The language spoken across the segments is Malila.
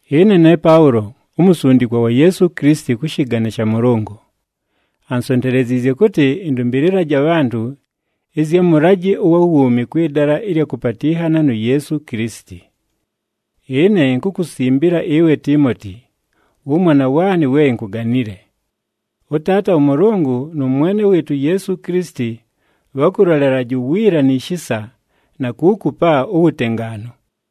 Ɨne ne Paʉlo, umusundikwa wa Yeesu Kilisiti kʉ shɨgane sha Mʉlʉngʉ. Ansonteleziizye kʉtɨ, ɨndʉmbɨlɨlaje abhantʉ ɨzya mʉlajɨ ʉwa wuumi kwɨ dala ɨlya kʉpatɨnhana nu Yeesu Kilisiti. Ɨne inkukusimbila ɨwe Tiimoti, wʉmwana waanɨ we inkuganile. ɄTaata ʉMʉlʉngʉ nʉ Mwene wɨɨtʉ uYeesu Kilisiti, bhakʉlolelaje uwiila ni shisa, na kuukupa uwutengaanu.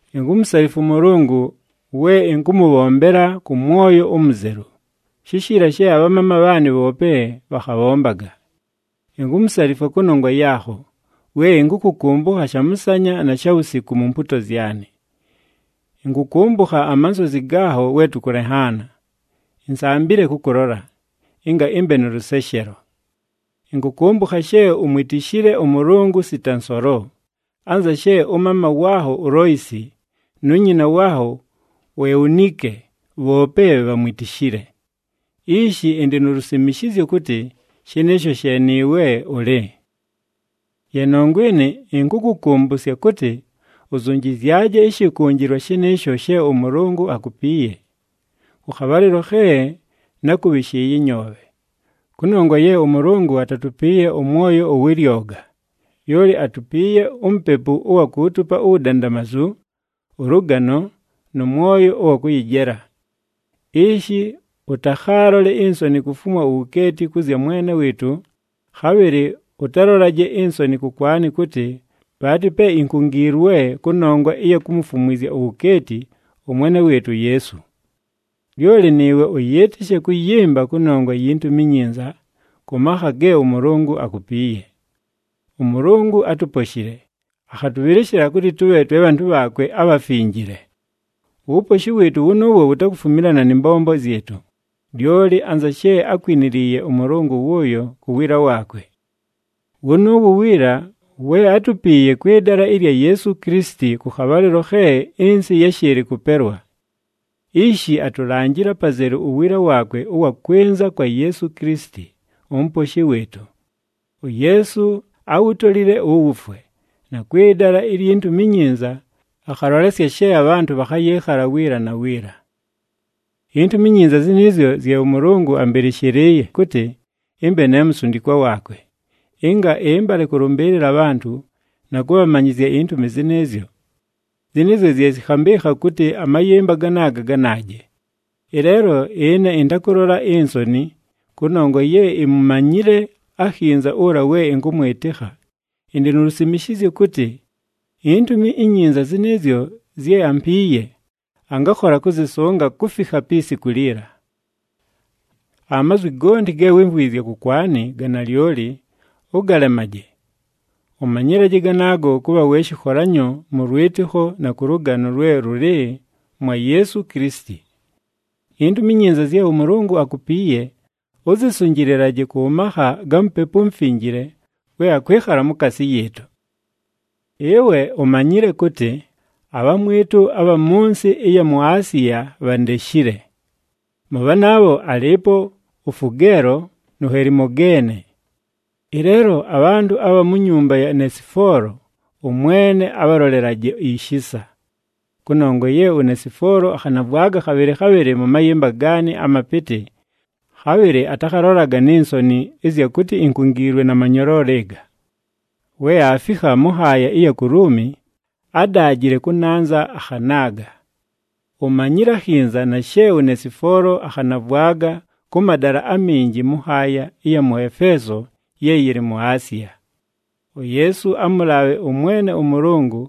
Inkumusalifwa ʉMʉlʉngʉ we ɨnkʉmʉbhombela kʉ mwoyo umuzelu, shishiila she abhamaama bhaanɨ bhoope bhakhabhombaga. Inkumusalifwa kʉnongwa yaakho, we ɨnkʉkʉkʉmbʉkha shamʉsanya na shawusiku mu mpuuto zyanɨ. Ɨnkʉkʉmbʉkha amansozi gaakho we tʉkʉlenhaana, insambile kʉkʉlola, ɨnga ɨmbe nʉ lʉseshelo. Ɨnkʉkʉmbʉkha she umwitishile ʉMʉlʉngʉ sita nsolo, anza she ʉmaama waakho uLoisi, nu nyina waakho uEunike bhoope bhamwitishile. Ishi ɨndɨ nu lusimishizyo kʉtɨ, shɨnɨɨsho she nɨɨwe ʉlɨ. Ye nongwa ɨnɨ, ɨnkʉkʉkʉmbʉsya kʉtɨ, uzunjizyaje ɨshɨkʉnjɨlwa shɨnɨɨsho she ʉMʉlʉngʉ akupiiye, kʉ khabhalɨlo khe nákʉbhɨshɨɨye ɨnyoobhe. Kʉnongwa ye ʉMʉlʉngʉ atatupiiye ʉmwoyo ʉwɨ lyoga, lyoli atupiiye uMupepu ʉwa kuutupa uwudandamazu, ʉlʉgano, nʉ mwoyo ʉwa kʉyɨjela. Ishi ʉtakhaalole insoni kufumwa uwukeeti kʉ zya Mwene wɨɨtʉ, khabhɨlɨ ʉtalolaje insoni kʉkwanɨ kʉtɨ, bhaatɨ pe inkungiilwe kʉnongwa ɨya kumufumwizya uwukeeti ʉMwene wɨɨtʉ uYeesu. Lyoli nɨɨwe ʉyɨɨtɨshe kʉyɨmba kʉnongwa yi Ntumi iNyinza, kʉ makha ge ʉMʉlʉngʉ akupiiye. ɄMʉlʉngʉ átuposhile, akhatʉbhɨlɨshɨla kʉtɨ tʉbhe twe bhantʉ bhaakwe abhafinjile. Uwuposhi wɨɨtʉ wʉnʉʉwo wutakufumilana nɨ mbombo zyɨtʉ, lyoli anza she ákwiniliiye ʉMʉlʉngʉ wʉʉyo ku wiila waakwe. Wʉnʉʉwo uwiila, we átupiiye kwɨ dala ɨlya Yeesu Kilisiti kʉ khabhalɨlo khe ɨnsɨ yáshɨɨlɨ kʉpelwa. Ishi atulanjile apazelu uwiila waakwe ʉwa kwɨnza kwa Yeesu Kilisiti, uMuposhi wɨɨtʉ. UYeesu áwutolile uwufwe, na kwɨ dala ilyi Ntumi iNyinza, akhalolesya she abhantʉ bhakhayɨɨkhala wiila na wiila. INtumi iNyinza zɨnɨɨzyo zye ʉMʉlʉngʉ ambɨlɨshɨlɨɨye kʉtɨ, ɨmbe ne musundikwa waakwe, ɨnga ɨmbale kʉlʉmbɨɨlɨla abhantʉ, na kʉbhamanyɨzya intumi zɨnɨɨzyo. Zɨnɨɨzyo zye zɨkhambɨɨkha kʉtɨ amayɨmba ganaaga ganaaje. Ɨleelo ɨne ɨntakʉlola insoni, kʉnongwa ye imumanyile akhinza ʉla we ɨnkʉmwɨtɨkha, ɨndɨ nu lusimishizyo kʉtɨ, iNtumi iNyinza zɨnɨɨzyo zye ampiiye, angakhola kʉzɨsʉnga kufikha pi siku liila. Amazwi gonti ge wímvwizye kʉkwanɨ ga nalyoli, ʉgalemaje. Ʉmanyɨlaje ganaago kʉbha we shɨkholanyo mʉ lwɨtɨkho na kʉ lʉgano lwe lʉlɨ mwa Yeesu Kilisiti. INtumi iNyinza zye ʉMʉlʉngʉ akupiiye, ʉzɨsʉnjɨlɨlaje kʉ makha ga Mupepu uMufinjile we akwɨkhala mukaasi yɨɨtʉ. Ɨwe umanyile kʉtɨ, abhamwɨtʉ abha mʉ nsɨ ɨya mu Asiya bhandeshile. Mʉ bhanaabho alɨɨpo uFugeelo, nu Helimogeene. Ɨleelo abhantʉ abha mu nyumba ya Nesifoolo, ʉMwene abhalolelaje ishisa. Kʉnongwa ye uNesifoolo akhanavwaga khabhɨlɨ khabhɨlɨ mʉ mayɨmba gaanɨ amapɨtɨ, khabhɨlɨ atakhalolaga ni nsoni ɨzya kʉtɨ inkungiilwe na manyoloolo ɨga. We aafikha mʉ nhaaya ɨya ku Luumi, ádaajile kʉnanza, akhanaaga. Umanyile akhinza na she uNesifoolo akhanavwaga kʉ madala aminji mʉ nhaaya ɨya mʉ Efeeso ye yɨlɨ mu Asiya. UYeesu amʉlaabhe ʉMwene ʉMʉlʉngʉ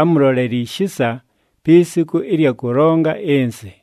amʉlolele ishisa pi siku ɨlya kʉlonga ɨnsɨ!